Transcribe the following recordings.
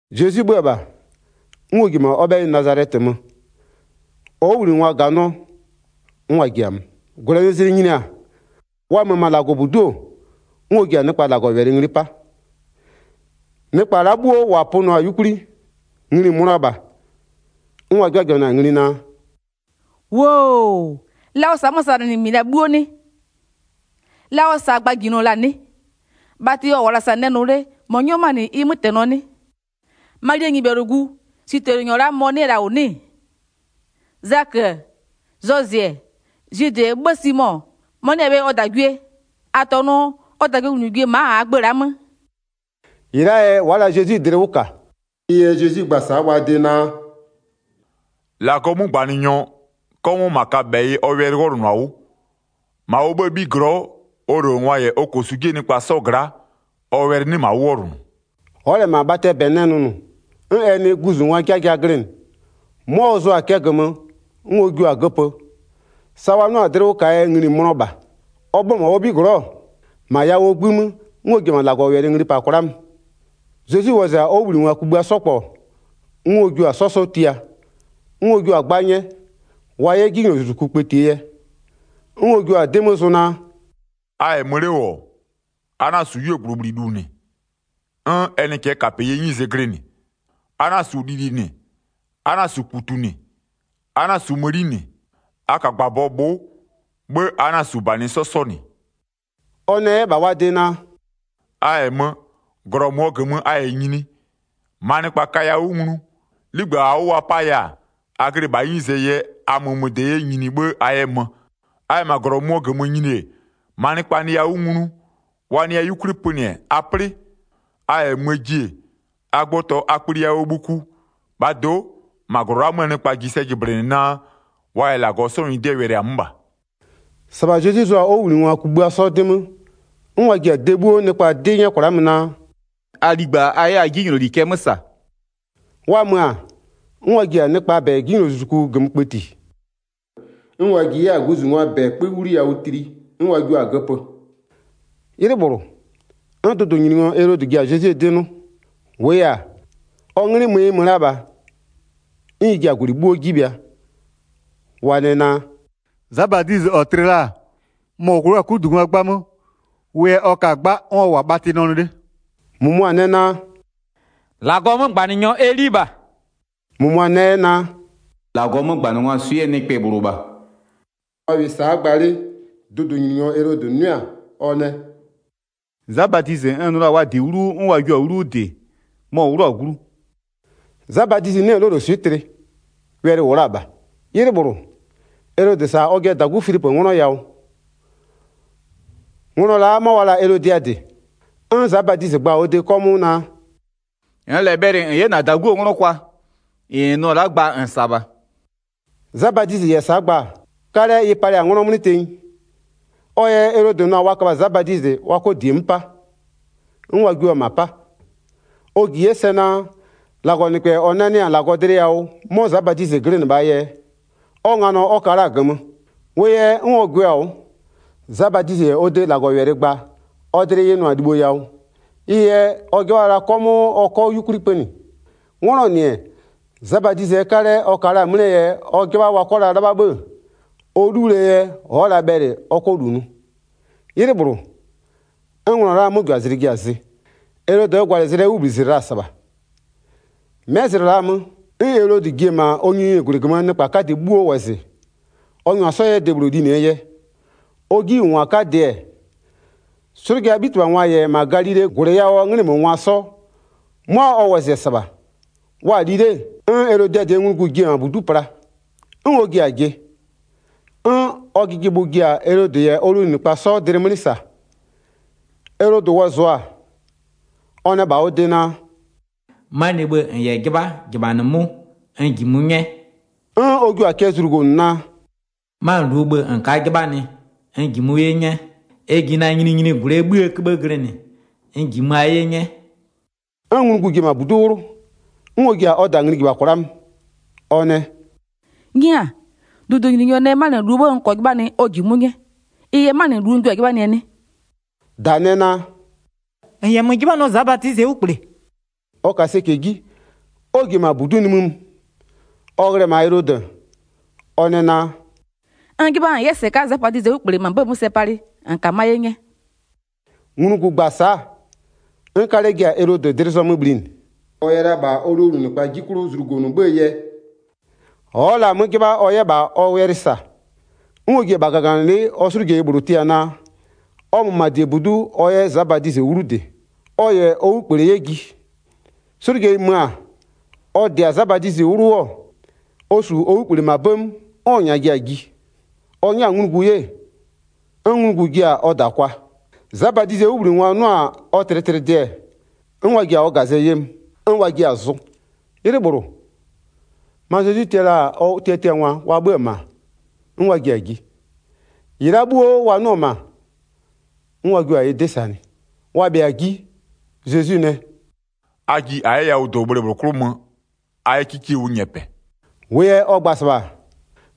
Zezwi 'bhö-ö -bha, 'n ɔ ji-e -ma ɔ 'bhɛyɩ Nazalɛtɩ mö, ɔ 'wʋbhlinɩngwa -ganɩɔ, 'n wa ji-a mö. 2-Gwlɛnɩzlɩ nyini-a, wa mö-ö -ma -Lagɔbudu'u-o, 'n ɔ ji-a nɩkpa -Lagɔwɛlɩ ngli 'pa. Nɩkpa la'a 'bhuo -wa pönɩɔ-a 'yukwli ngli-i mönʋa -bha. 'N wa 'jɩbhajɩbhanɩ-a ngli naa: “-Woo-o! La ɔ -sa-a 'mö-ö -sa -nɩ -mɩ -la 'bhuo 'nɩ? La ɔ -sa-a gbajinɔ -la 'nɩ? Bhatɩ ɔ -wʋ-ɔ -la -sa nɛ nʋ 'le, -mɔ 'nyɔ 'mö-a -nɩ ɩ 'mötɛnɔ 'nɩ? Malie nyɩbhɛlʋgu, switɛlɩnyɔ la'a mɔ-ɔ 'nɩ-ɛ -la -wʋ 'nɩ-ɩ? Zakö-ö, Zozɩ, Zwidɩ, 'bhë Simo, mʋa 'nɩ-ɛ bhe ɔ -dagwie? -A -tɔnʋ ɔ -dagwienglugwie-e ma'a -aa gbë la'a 'mö?” -Ɩ la'aa yɛ wa'a la Zezwi dlɩ 'wʋ -ka. Ɩ yɛ Zezwi gba-a sa'a wa de naa: “-Lagɔɔ 'mögbanɩnyɔ, 'kɔmʋʋ -ma kaböbhɛyɩ ɔ wɛlɩ 'wɔlʋnʋ-a 'wʋ. -Ma ɔ 'bhëë 'bhiglɔ'ɔ, ɔ -lowlengwa -yɛ ɔ -kosu 'jie nɩkpa 'sɔ gla'a, ɔ wɛlɩ 'nɩ -ma 'wʋ 'wɔlʋnʋ.” Ɔ'ɔ -lɛ -ma bhatɩɛ -bɛ nɛ nʋnʋ, 'n ɛ nɩ guzungwaa 'jaja glɩnɩ, 'mʋa ɔ zʋ-a cɛ -gömö 'n ɔ jua-a göpö. Sa wa 'nɩɔ-a dlɩ 'wʋ -kaa yɛ ngli-i mönɔ -bha. Ɔ 'bhö-ö -ma ɔ 'bhiglɔ'ɔ, -ma yawʋɔ 'gbï 'mö, 'n ɔ ji-e -ma -Lagɔwɛlɩ ngli -pa kwla'a mö. Zezwi wɔzɩ-a ɔ 'wʋbhlinɩngwa kugbïa 'sɔ -kpɔ, 'n ɔ jua-a 'sɔ 'sɔ 'sɔ tia, 'n ɔ jua-a 'gba 'nyɛ, wa 'yɛ 'jinylozuzuku kpëtie yɛ. 'N ɔ jua-a 'dɩ 'mö zʋ naa: “A -yɛ mö 'le -wʋ-ɔ, a 'na-a -su 'yuogblʋbhlilu -nɩ, 'n ɛ nɩ cɛɛkapeyie 'nyize glɩnɩ. A 'na-a -su lili -nɩ, a 'na-a -su -kputu -nɩ, a 'na-a -su mëni -nɩ. A -ka -gbabɔ bhʋ'ʋ, 'bhë a 'na-a -su -banɩ 'sɔ 'sɔ -nɩ.” Ɔ nɛ 'yɛ -bha wa de naa: “A -yɛ mö, -glɔ -mʋɔ -gömö a -yɛ nyini, -maa nɩkpa kaya 'wʋ nglu, 'ligbë -aa 'wʋ wa 'paya-a, a glɩ -bhaa 'nyize yɛ, a mömöde -yɛ nyini 'bhë a 'yɛ mö. A -yɛ -ma -glɔ -mʋmʋɔ -gömö nyini-e, -maa nɩkpa nɩya 'wʋ nglu, wa nɩya 'yukwli pönɩ-ɛ, a 'plɩ. A -yɛ möö ji-e, a gbɔtɔ a kpli yawʋɔ bhuku. -Bhaa do'o, -ma -glɔ la'a 'möö nɩkpa ji sɛ jɩblɩnɩ naa, wa -yɛ -Lagɔ 'sɔɔ nyɩdɩɛ wɛlɩ-a 'mö -bha.” 12-Sɩbha Zezwi zʋ-a ɔ 'wʋbhlinɩngwa kugbïa 'sɔ 'dɩ 'mö 'n wa ji-a de 'bhuo nɩkpa 'dɩ -nyɛ kwla'a mö naa: “A ligba a 'yɛ a 'jinyloli cɛ 'mö -sa.” Wa mö-a, 'n wa ji-a nɩkpaa -bɛ 'jinylozuzuku -gömö kpëti. 'N wa ji 'yɛ-a guzungwaa -bɛ 'kpö 'wliyawʋ tli, 'n wa jua-a göpö. 'Ylɩ -bhlʋ, 'n dʋdʋnyininyɔ Elodɩ ji-a Zezwie 'dɩ 'nʋ. -Wʋʋ yɛ-a, ɔ 'nglɩ mö ɩ mö la -bha, 'n ɩ ji-a -gwlɩ 'bhuo 'ji bhɩa. Wa nɛ naa: “Za Badizɩ -ɔ tlɩ la-a, mɔ-ɔ 'wlʋ-a 'kudungwa 'gba 'mö. Wʋ yɛ ɔ ka-a 'gba 'n ɔ -wʋ-a bhatɩ nɛ nʋ 'le.” 15-Mʋmʋa nɛ naa: “-Lagɔɔ 'mögbanɩnyɔ Eli -bha.” -Mʋmʋa nɛ 'yɛ naa: “-Lagɔɔ 'mögbanɩngwaa swɩ'ɩɛ nɩkpɛ -bhlʋ -bha.” Wa -wɩɩ sa'a gba 'le, dʋdʋnyininyɔ Elodɩ 'nʋɩ-a, ɔ nɛ: “Za Badizɩ n nʋ la-a wa -dɩ 'wlu 'wʋ 'n wa jio-a 'wlu 'wʋ -dɩ-ɛ, mɔ-ɔ 'wlʋ-a glu.” Za Badizɩ 'nɩ-ɛ 'loloswɩ'ɩ tlɩ, wɛlɩ -wʋ la-a -bha. 'Ylɩ -bhlʋ, Elodɩ -sa-a ɔjɩɛ -dagu Filipö 'nglɔ yawʋ. Nglɔ la'a 'mɔ wa la-a Elodiadɩ. 'N Za Badizɩ gba-a ɔ de 'kɔmʋʋ naa: “-Nn -lɛ bhɛlɩ -n 'yɛ -na -daguo 'nglɔ kwa, -ɩ -n nʋ-ɔ la'a gba -n -sa -bha.” Za Badizɩ -yɛ sa'a gba-a, 'kalɛ ɩ palɩ-a 'nglɔ 'mlɩ tenyi. Ɔ yɛ Elodɩ nʋ-a wa köbha Za Badizɩ wa 'kɔ -die 'mö 'pa, 'n wa jio-o -ma 'pa. Ɔ -ji 'yɛ sɛ naa, -Lagɔnɩkpɛ -ɔ nanɩ-a -Lagɔ dlɩ yawʋ 'mɔ Za Badizɩ glɩnɩ -bhaa yɛ, ɔ nganɔ ɔ ka la-a -gömö. Wʋ yɛ, 'n ɔ gwɩɔ-a 'wʋ. Za Badizɩ -yɛ ɔ de -Lagɔwɛlɩ gba-a, ɔ dlɩ ɩ nʋ-a libho yawʋ, ɩ yɛ ɔ 'jɩbha la 'kɔmʋʋ ɔ 'kɔ 'yukwli pönɩ. 'Nglɔɔ -nɩ-ɛ, Za Badizɩɛ 'kalɛ ɔ ka-a 'mlɩɛ yɛ ɔ 'jɩbha wa 'kɔ la 'lɩbha 'bhë-ë, ɔ 'luwlie yɛ ɔ'ɔ la bhɛlɩ ɔ 'kɔ -lu nʋ. 'Ylɩ -bhlʋ, 'n nglɔ la'aa 'möjʋazlɩ ji-a zɩ. Elodɩɛ gwalɩzlɩɛ 'wʋbhlizlɩ la-a -sɩbha, 'mɛ zlɩ la'a 'mö, 'n Elodɩ ji-e -ma ɔ nyininyinigwlɩ -gömöö nɩkpa 'kadɩ 'bhuo wɔzɩ, ɔ -nyʋa 'sɔ 'yɛ debhlʋ linɩɛ yɛ. Ɔ 'jiwʋngwa 'kadɩ-ɛ, 'slʋjaa 'bhitɩbhangwa -yɛ -ma Galilee -gwlɩ yawʋɔ 'nglɩmöngwa 'sɔ, 'mʋa ɔ wɔzɩ-ɛ -sɩbha. Wa-a li 'le, 'n Elodiadɩɛ nglugu ji-e -ma -budu'u pla, 'n ɔ ji-a jɩ. 'N ɔ jɩjɩbhʋ ji-a Elodɩ -yɛ ɔ lowlunɩkpa 'sɔ dlɩ 'mlɩ -sa. Elodɩ wɔzɩɔ-a, ɔ nɛ -bha ɔ de naa: “'Manɩɛ bhë -n -yɛ 'jɩbha -jɩbhanɩmʋ'ʋ, n -jimʋ 'nyɛ.” 'N ɔ jio-a cɛ zlugonʋ naa: “'Manɩluo bhë -n ka'a 'jɩbhanɩ, n -jimʋ 'ye 'nyɛ. Ɛ ji na nyininyinigwlɩɛ 'bhïë 'köbhë glɩnɩ, n -jimöa 'ye 'nyɛ.” 'N nglugu ji-e -ma -budu'u 'wlʋ, 'n ɔ ji-a ɔ -da ngli -jɩbha kwla'a mö. Ɔ nɛ: “'Nyia, dʋdʋnyininyɔ nɛ 'manɩluo 'bhë n -kɔɔ 'jɩbhanɩ ɔ -jimʋ'ʋ 'nyɛ, ɩ yɛ 'manɩlu n jio-a 'jɩbhanɩɛ 'nɩ?” -Da nɛ naa: “-N -yɛ mö 'jɩbhanɩɔ Za Badizɩɛ 'wlukple.” Ɔ ka sɛcɛ 'ji, 'n ɔ ji-e -ma -budu'u nimï mö, ɔ ghlɩ-ɛ -ma Elodɩ-ɛ, ɔ nɛ naa: “N 'jɩbha -n 'yɛ -sɩka'a Za Badizɩɛ 'wlukple -ma 'bëë 'mö sɛ palɩ -n -kamö'öa 'ye 'nyɛ.” Nglugu gba-a sa'a, 'n 'kalɛ ji-a Elodɩ dlɩ zɔmö bhlinɩ. Ɔ yɛ la -bha ɔ lowlunɩkpa 'ji 'klʋ zlugonʋ 'bhëë yɛ, ɔ'ɔ la-a 'mö 'jɩbha ɔ 'yɛ -bha ɔ wɛlɩ -sa. 'N ɔ ji-a -bha -gaganɩlɩ'ɩ ɔ 'slʋjeyi -bhlʋ tia naa, ɔ mö -ma -diebudu'u ɔ 'yɛ Za Badizɩ 'wlu 'wʋ -dɩ, ɔ -yɛ ɔ 'wlukple 'yɛ ji. 'Slʋjeyi mö-a, ɔ -dɩ-a Za Badizɩ 'wlu 'wʋ, ɔ -su ɔ 'wlukple -ma 'bëë 'mö, 'n ɔ -nyaa ji-a ji. Ɔ 'nyɛ-a nglugu 'ye, 'n nglugu jia-a ɔ -da kwa. Za Badizɩɛ 'wʋbhlinɩngwa 'nʋ-a ɔ tlɩtlɩdɩ-ɛ, 'n wa ji-a ɔ -gazɛ 'ye mö, 'n wa jiɛ-a zʋ. 'Ylɩ -bhlʋ, ma Zezwi tia la-a ɔ tiatiangwa wa 'bhö-ö -ma, 'n wa ji-a ji, -ɩ la'a 'bhuo wa nʋ-ɔ -ma, 'n wa jio-a ɩ 'dɩ -sanɩ. Wa bhɩa-a 'ji, Zezwi nɛ: “A ji -a 'yɛ yawʋdobhle -bhlʋ 'klʋ mö, a 'yɛ 'kikie 'wʋ nyɛpɛ.” -Wʋʋ yɛ ɔ gba-a -sɩbha,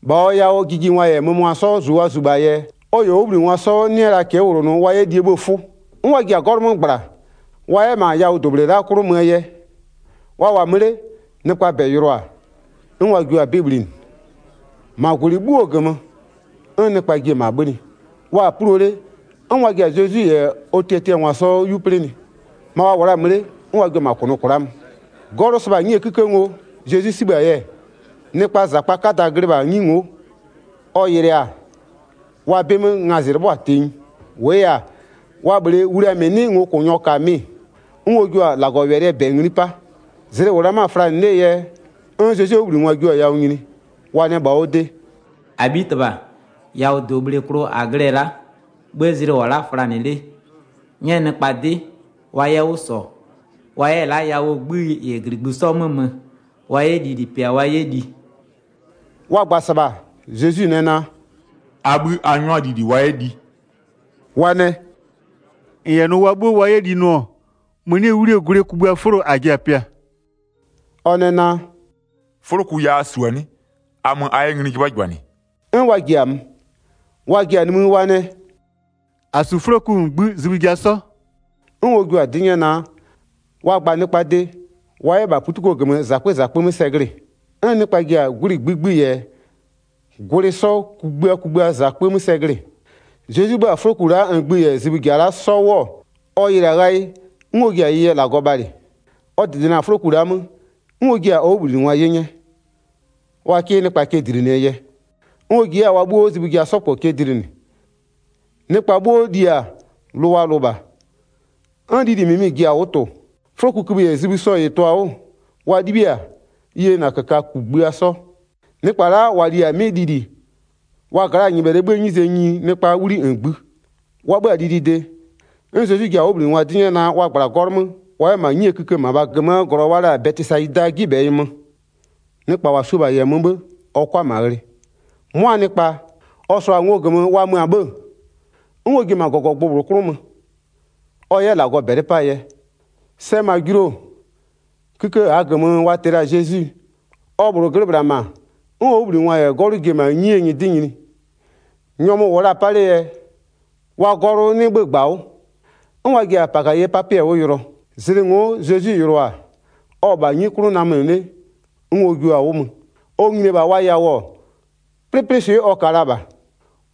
-bha ɔ yawʋɔ jijingwa -yɛ mömöngwa 'sɔ -zu wa -zu -bhaa yɛ, ɔ -yɛ ɔ 'wʋbhlinɩngwa 'sɔ 'nɩ la cɛ'ɛ -wlonʋ wa 'yɛ lie 'bhëë 'fʋ. 'N wa ji-a 'gɔlʋ 'mö -gbla, wa 'yɛ -ma yawʋdobhle la'a 'klʋ möö yɛ. Wa -wʋ-a mö 'le nɩkpaa -bɛ yɩlʋa-a, 'n wa jio-a jɩblɩnɩ. -Ma -gwlɩ 'bhuo -gömö, 'n nɩkpa ji-e -ma 'bhönɩ, wa-a 'pulo 'le 'n wa ji-a Zezwi -yɛ ɔ tiatiangwa 'sɔ 'yu 'plɩnɩ, ma wa -wʋ la-a mö 'le 'n wa jua-a -ma -kʋnʋ kwla'a mö. 'Gɔlʋ sɩbha-a 'nyie 'kïkë ngo Zezwi 'sibhë-a yɛ, nɩkpaa -zakpaa 'kada glɩ -bha 'nyi ngo'o. Ɔ yɩlʋa-a, wa 'bɩ 'mö ngazɩ 'lɩbhɔ-a tenyi. -Wʋʋ yɛ-a, wa -bhlee wlia -mɩ 'nɩ ngokʋnyɔ -ka mɩ-ɩ. 'N ɔ jua-a -Lagɔwɛlɩɛ -bɛ ngli 'pa. Zlɩ-ɩ -wʋ la 'mö-a flanɩ 'lee yɛ, 'n Zezwie 'wʋbhlinɩngwa jio-a yawʋ nyini, wa nɛ -bha ɔ de: “-Abhitɩbha, yawʋdobhle klʋ -a glɩ-ɛ la'a, 'bhë zlɩ -wʋ-ɔ la'a flanɩ 'le. 'Nyɛ nɩkpa 'dɩ, wa 'yɛ 'wʋ -sɔ, wa 'yɛ la'a yawʋɔ 'gbï -yɛ -gligbï 'sɔɔ 'mö mö, wa 'yɛ lili pɩa wa 'yɛ li.” Wa gba-a -sɩbha Zezwi nɛ naa: “A 'bhï a 'nyʋa lili wa 'yɛ li.” Wa nɛ: “-N -yɛ nʋ wa 'bhuo wa 'yɛ li nʋ-ɔ, mënie 'wlie gwlɩ kugbïaa 'fʋlo -a ji-a pɩaa.” Ɔ nɛ naa: “'Fʋloku ya a -su-a 'nɩ? A mö a 'yɛ ngli 'jɩbhajɩbhanɩ.” 'N wa ji-a mö, wa ji-a nimï wa nɛ: “-A -su 'fʋloku -ngbï zibhï ja 'sɔ.” 'N ɔ jua-a 'dɩ 'nyɛ naa, wa gba nɩkpaa de, wa 'yɛ -bha -putuko -gömö -zakpö -zakpö 'mö sɛ glɩ-ɩ. 'N nɩkpa ji-a gwlɩ -ngbï -ngbï -yɛ gwlɩ 'sɔ kugbïa kugbïaa -zakpö 'mö sɛ glɩ-ɩ. Zezwi 'libhï-a 'fʋloku la'a -ngbï -yɛ zibhï ja 'sɔ la'a 'wʋ-ɔ, ɔ yɩlɩ-a ghayɩ, 'n ɔ ji-a ɩ yɛ -Lagɔ bhalɩ, ɔ -dɩdɩnɩ-a 'fʋloku la'a 'mö, 'n ɔ jiɩ-a ɔ 'wʋbhlinɩngwa 'ye 'nyɛ, wa 'kɩ nɩkpa cɛ dlinɩɛ yɛ. 'N ɔ ji 'yɛ-a wa 'bhuo zibhï ja 'sɔ -kpɔ cɛ dlinɩ. Nɩkpa 'bhuo li-a, lʋ wa lʋ -bha. 'N lili -mɩmɩ ji-a 'wʋ tʋ-ʋ. 'Fʋlokukïbhï -yɛ zibhï 'sɔ -ɩ tʋ-a 'wʋ, wa 'libhiɩ-a, ɩ yena -köka kugbïa 'sɔ. Nɩkpa la'a -wa li-a 'mɩ lili, wa gla'aa nyɩbhɛlɩɛ 'bhïë 'nyize nyini nɩkpaa 'wli -ngbï. Wa 'bhö-a lilide, 'n Zezwi ji-a ɔ 'wʋbhlinɩngwa 'dɩ 'nyɛ naa, wa -gbla 'gɔlʋ 'mö wa 'yɛ -ma 'nyie kïkë -mabha -gömöö -glɔ wa la-a Bɛtɩsayidaa 'jibhɛyɩ mö. Nɩkpa -wa su-o -bha -yɛ mö 'bhë, ɔ 'kʋa -ma ghlɩ. 'Mʋa nɩkpa, ɔ -sʋa-a ngo -gömö wa mö-a 'bhë-ë, 'n ɔ ji-e -ma -gɔgɔgbʋ -bhlʋ 'klʋ mö, ɔ 'yɛ -Lagɔ -bɛlɩ 'paa yɛ. Sɛ mö-a julu-o, kïkë -aa -gömö wa tɩ la-a Zezwi, ɔ -bhlʋ glɩ -bhla -ma, 'n ɔ 'wʋbhlinɩngwa -yɛ 'gɔlʋ ji-e -ma 'nyi nyɩdɩ nyini. Nyɔmʋ -wʋ la-a 'pa 'lee yɛ, wa 'gɔlʋ 'nɩ 'bhö-ö -gbawʋ, 'n wa ji-a -pakayɩpapɩɛ 'wʋ yʋlɔ. Zlɩ ngo'o Zezwi yɩlʋa-a, ɔ-ɔ -bha 'nyi 'klʋ namönɩ 'le 'n ɔ jua-a 'wʋ mö. Ɔ nyini-e -bha wa yawʋ-ɔ, 'plɩplɩswɩ'ɩ ɔ ka la -bha.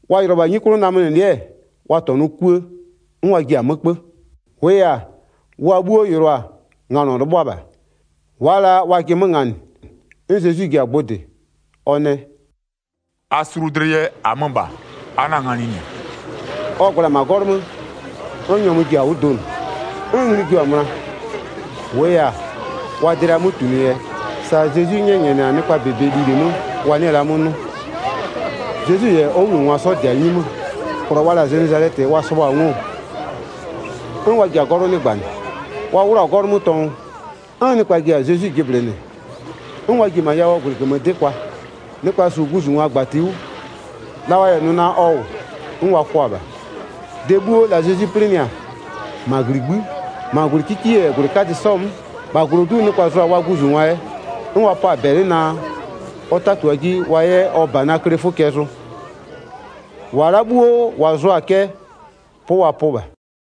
Wa yɩlɩɔ-ɔ -bha 'nyi 'klʋɔ namönɩlɩ'ɩ-ɛ, wa -tɔnʋɔ 'kuë, 'n wa ji-a 'mö 'kpö. 50-Wʋʋ yɛ-a, wa 'bhuo yɩlɩɔ-a nganɔ 'lɩbhʋa -bha. Wa'a la wajɩ 'mö -nganɩ. 'N Zezwi ji-a gbʋ -dɩ, ɔ nɛ: “A sulu dlɩ yɛ, -amö -bha, a 'na-a nganɩ -nɩ.” Ɔ -gbla-a -ma 'gɔlʋ 'mö, 'n nyɔmʋ ji-a 'wʋ donʋ. 'N ngli jua-a möna. 52-Wʋʋ yɛ-a, wa dlɩaa 'mötunʋ yɛ sa Zezwi 'nyɛnyɛnɩ-a nɩkpaa -bebe lili 'mö wa 'nɩɩ-ɩ la 'mö 'nʋ. Zezwi -yɛ ɔ 'wʋbhlinɩngwa 'sɔ -dɩ-a 'nyi 'mö, -glɔ wa la-a Zenezalɛtɩ wa sɩbhʋ-a ngo-o, 'n wa ji-a 'gɔlʋ 'nɩgbanɩ. Wa 'wlʋ-ɔ -ma 'gɔlʋ 'mö tɔngʋ, 'n nɩkpa ji-a Zezwi jɩblɩnɩ. 'N wa ji-e -ma yawʋɔ -gwlɩ -gömö 'dɩ kwa. Nɩkpa -su guzungwa -gbatia 'wʋ, la wa -yɛ 'nʋ naa ɔ -wʋ, 'n wa kwʋa-a -bha. De 'bhuo la Zezwi 'plɩnɩ-a, -ma -gligbï'ï, -ma -gwlɩ 'kikie -yɛ -gwlɩ 'kadɩ 'sɔɔ 'mö, -bha -glodu'u nɩkpa zʋ-a wa guzungwa yɛ, 'n wa pɔ-a -bɛlɩ naa, ɔ 'tatua 'ji wa 'yɛ ɔ -banaa kle 'fʋ cɛ zʋ. -Wa la'a 'bhuo -wa zʋa-a cɛ, 'pʋ wa 'pʋ -bha.